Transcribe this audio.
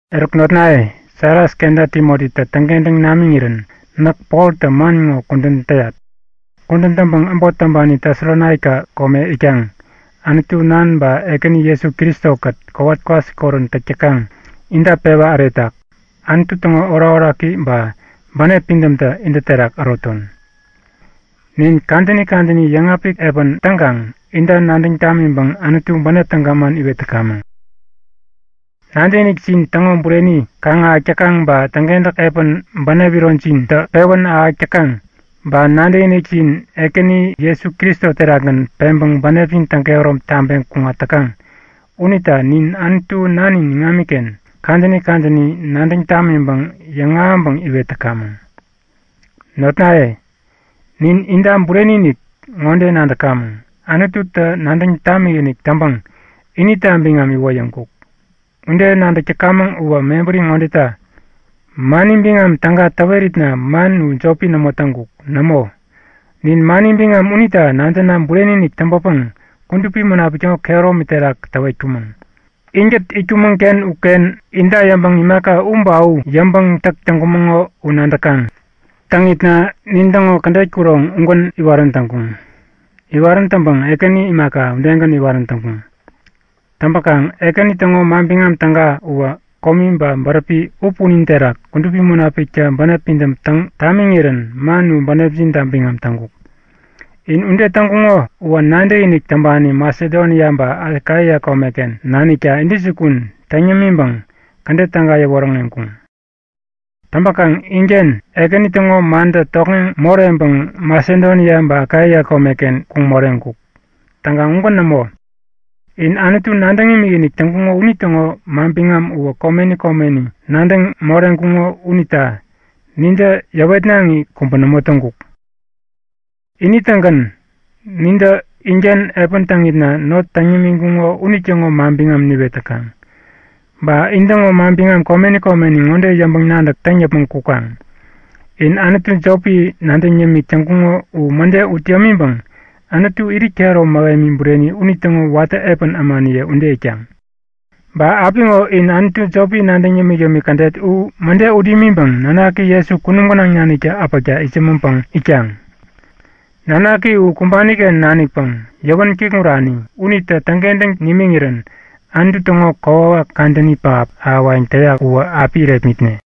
Eruk notnaye, Silas kenta Timotitä täŋkentäŋ namiŋirän näk Poltä man ŋo kudän täyat. Kudän täŋpäŋ äbot täŋpani Tesalonaika kome itkaŋ, Anutu Nan ba Ekäni Jesu Kristo-kät kowat kwasikorän täk täkaŋ, inta pewa äretak. Anutu täŋo orakoraki ba bänep pidämtä intä terak äroton. Nin kadäni kadäni yäŋapik epän täŋkaŋ inta nadäŋ tamiŋpäŋ Anutu bänep täga man iwet täkamäŋ. Nadäkinikjin täŋo bureni kaŋ-ahäk täkaŋ ba täŋkentäk epän bänep ironjintä pewän ahäk täkaŋ ba nadäkinikjin Ekäni Jesu Kristo terakgän peŋpäŋ bänepjin täŋkehärom taŋpeŋ kuŋat täkaŋ unita nin Anutu Nanin iŋamiken kadäni kadäni nadäŋ tamiŋpäŋ yäŋahäŋpäŋ iwet täkamäŋ. Notnaye, nin inta bureni-inik ŋode nadäkamäŋ; Anututä nadäŋ tamikinik täŋpäŋ inita biŋam iwoyäŋkuk. Ude nadäk täkamäŋ uwä mebäri ŋodeta; Mani biŋam Täga täweritna man u jopi nämo täŋkuk. Nämo, nin mani biŋam unita nadäna bureni-inik täŋpäpäŋ Kudupi Munapik täŋo kehäromi terak täwetkumäŋ. Inkät itkumäŋ-ken uken inta yäŋpäŋ imaka u ba u yäŋpäŋ täk täŋkumäŋo u nadäkaŋ. Täŋitna nintäŋo kädet kuroŋ ugän iwarän täŋkuŋ. Iwarän täŋpäŋ Ekäni imaka, udegän iwarän täŋkuŋ. Täŋpäkaŋ Ekäni täŋo Manbiŋam Täga uwä komi ba bäräpi u punin terak Kudupi Munapiktä bänep pidäm täŋ tamiŋirän man u bänepjinta biŋam täŋkuk. In ude täŋkuŋo uwä nadäkinik täŋpani Masedonia ba Akaia komeken nanikta intäjukun täŋ yämiŋpäŋ kädet täga yäwoŋäreŋkuŋ. Täŋpäkaŋ inken, Ekäni täŋo mantä tokŋeŋ moreŋpäŋ Masedonia ba Akaia komeken kuŋ moreŋkuk. Täŋkaŋ, ugän nämo. In Anutu nadäŋ imikinik täŋkuŋo unitäŋo manbiŋam uwä komeni komeni nadäŋ moreŋkuŋo unita nintä yäwetnaŋi kubä nämo täŋkuk. Ini-tägän, nintä inken epän täŋitna not täŋ nimiŋkuŋo unitäŋo manbiŋam niwet täkaŋ. Ba intäŋo manbiŋam komeni komeni yäŋpäŋ-nadäk ŋode täŋ yäpmäŋ kukaŋ; In anutu jopi nadäŋ yämik täŋkuŋo u mäde ut yämiŋpäŋ Anutu irit kehäromi mähemi bureni unitäŋo watä epän ämaniye ude itkaŋ. Ba apiŋo in anutu jopi nadäŋ yämik-yämik kädet u mäde ut imiŋpäŋ nanaki Jesu kunum gänaŋ naniktä äpäkta itsämäŋpäŋ itkaŋ. Nanaki u kumbani-ken nanikpäŋ yäwän kikŋurani unitä täŋkentäŋ nimiŋirän Anutu täŋo kokwawak kadäni pähap ahäwayäŋ täyak uwä api irepmitne.